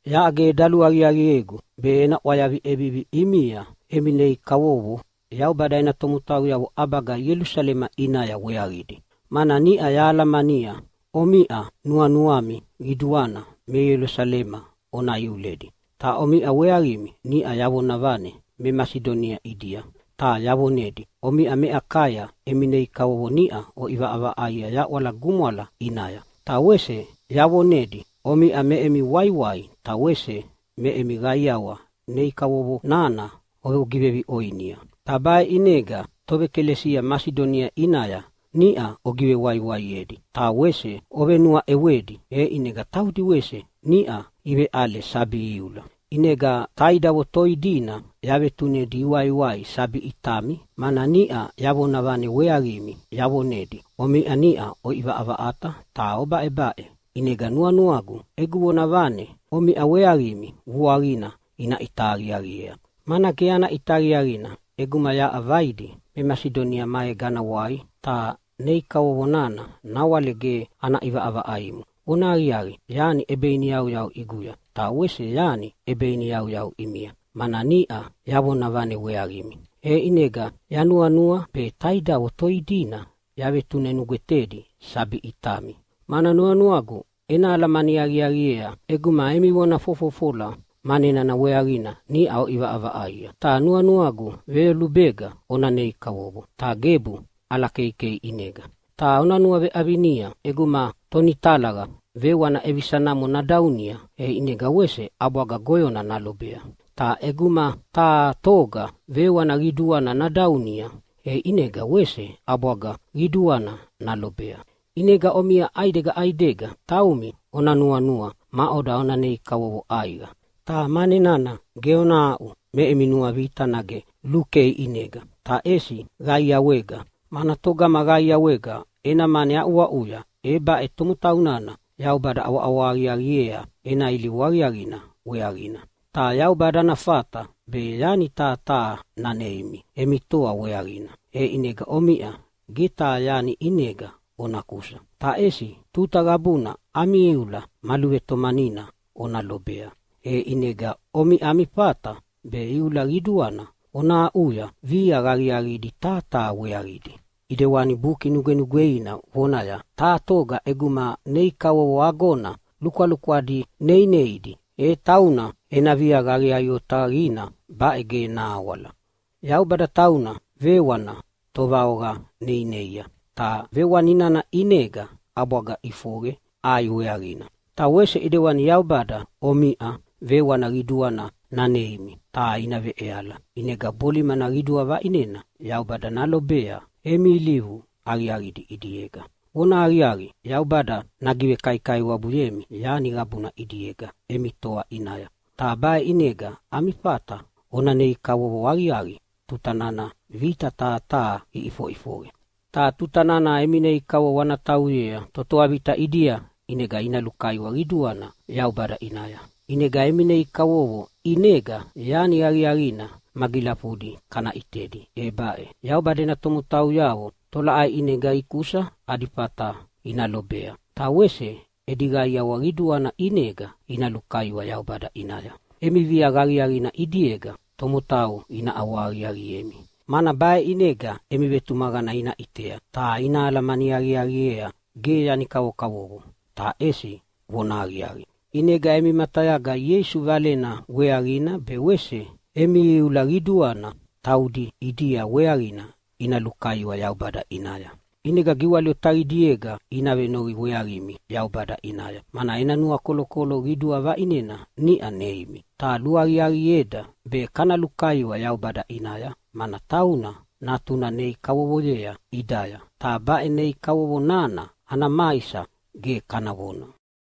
Yaʼa ge daluaqiaqiegu be ena ʼwayavi ʼevivi ʼimia emi nei kavovo Yaubada ena tomotauyavo ʼabaga Ielusalema ʼinaya weaqidi, mana niʼa yahalamania omiʼa nuanuami qiduana me Ielusalema ona iuledi. Ta omiʼa weaqimi niʼa yavonavane me Masidonia ʼidia ta yavonedi omiʼa me Akaya emi nei kavovo niʼa oʼivaʼavaʼaia yaʼwala gumwala ʼinaya. Ta wese yavonedi omiʼa me emi waiwai ta wese me emi qaiawa nei kavovo nana ogiveviʼoinia. Ta baʼe ʼinega toʼekalesia Masidonia ʼinaya niʼa ogivewaiwaiedi ta wese ovenuaʼewedi, e ʼinega taudi wese niʼa iveʼale sabi iula. ʼInega taidavo toi dina yavetunedi iwaiwai sabi ʼitami, mana niʼa yavonavane weaqimi yavonedi omiʼa niʼa oʼivaʼavaʼata ta obaʼebaʼe. ʼInega nuanuagu egu vonavane omiʼa weaqimi vuaqina ina ʼita aqiaqiea, mana ge ana ʼita aqiaqina ʼeguma yaʼa vaidi me Masidonia maega ana wai ta nei kavovo nana nawale ge ana ʼivaʼavaʼaimo. Vonahaqiaqi, yani ʼebeiniyauyau ʼiguya, ta wese yani ʼebeiniyauyau ʼimia, mana niʼa yavonavane weaqimi. E ʼinega yanuanua be taidavo toi dina yavetune nugwetedi sabi ʼitami, mana nuanuagu ena alamani aqiaqiea ʼeguma emi vona fofofola mane nana weaqina niʼa oʼivaʼavaʼaia. Ta nuanuagu veyolubega ona nei kavovo, ta gebu ʼalakeikei ʼinega. Ta ona nuaveʼavinia, ʼeguma tonitalaqa vewana ʼevisa namo nadaunia, e ʼinega wese ʼabwaga goyona nalobea. Ta ʼeguma taha toga vewana qiduana nadaunia, e ʼinega wese ʼabwaga qiduana nalobea. ʼInega omiʼa ʼaidega ʼaidega taumi ona nuanua maʼoda ona nei kavovo ʼaiqa. Ta mane nana ge ona aʼu me emi nuavita nage lukei ʼinega, ta ʼesi qaiawega, mana togama qaiawega ena mane aʼuaʼuya, e baʼe tomotau nana Yaubada ʼawaʼawa aqiaqiea ena ilivu aqiaqina weaqina. Ta Yaubada ana fata be yani taha taha naneimi emi toa weaqina, e ʼinega omiʼa ge taha yani ʼinega ona kusa, ta ʼesi tuta qabuna ami iula ma luvetomanina ona lobea, e ʼinega omiʼa ami fata be iula qiduana ona aʼuya viaqa aqiaqidi taha taha weaqidi. ʼIdewani Buki Nugwenugweina vonaya, “Taha toga ʼeguma nei kavovo agona lukwalukwadi neineidi, e tauna ena viaqa aqiaqi otaqina baʼe ge nahawala.” Yaubada tauna vewana tovaoqa neineia, ta vewana nana ʼinega ʼabwaga ʼifoqe ʼai weaqina. Ta wese ʼidewani Yaubada omiʼa vewana qiduana naneimi ta ina veʼeala. ʼInega bolimana qidua vaʼinena Yaubada nalobea emi ilivu aqiaqidi ʼidiega. Vonahaqiaqi, Yaubada nagivekaikaiwabuyemi yani qabuna ʼidiega emi toa ʼinaya. Ta baʼe ʼinega ami fata ona nei kavovo aqiaqi tuta nana vita taha taha iʼifoʼifoqe. Ta tuta nana emi nei kavovo ana tauyea totoa vita ʼidia ʼinega ina lukaiwa qiduana Yaubada ʼinaya. ʼInega emi nei kavovo ʼinega yani aqiaqina magilafudi kana ʼitedi, e baʼe: Yaubada ena tomotauyavo tolaʼai ʼinega ikusa adi fata ina lobea, ta wese edi qaiawa qiduana ʼinega ina lukaiwa Yaubada ʼinaya. Emi viaqa aqiaqina ʼidiega tomotau ina ʼawahaqiaqiemi, mana baʼe ʼinega emi vetumaqana ina ʼitea ta ina alamani aqiaqiea ge yani kavokavovo ta ʼesi vonahaqiaqi. ʼInega emi matayaga Ieisu Valena weaqina be wese emi iula qiduana taudi ʼidia weaqina ina lukaiwa Yaubada ʼinaya. ʼInega giwali otaqidiega ina venoqi weaqimi Yaubada ʼinaya, mana ena nuakolokolo qidua vaʼinena niʼa neimi. Ta luaqiaqieda be kana lukaiwa Yaubada ʼinaya, mana tauna Natuna nei kavovoyea ʼidaya, ta baʼe nei kavovo nana ana maisa ge kana vona!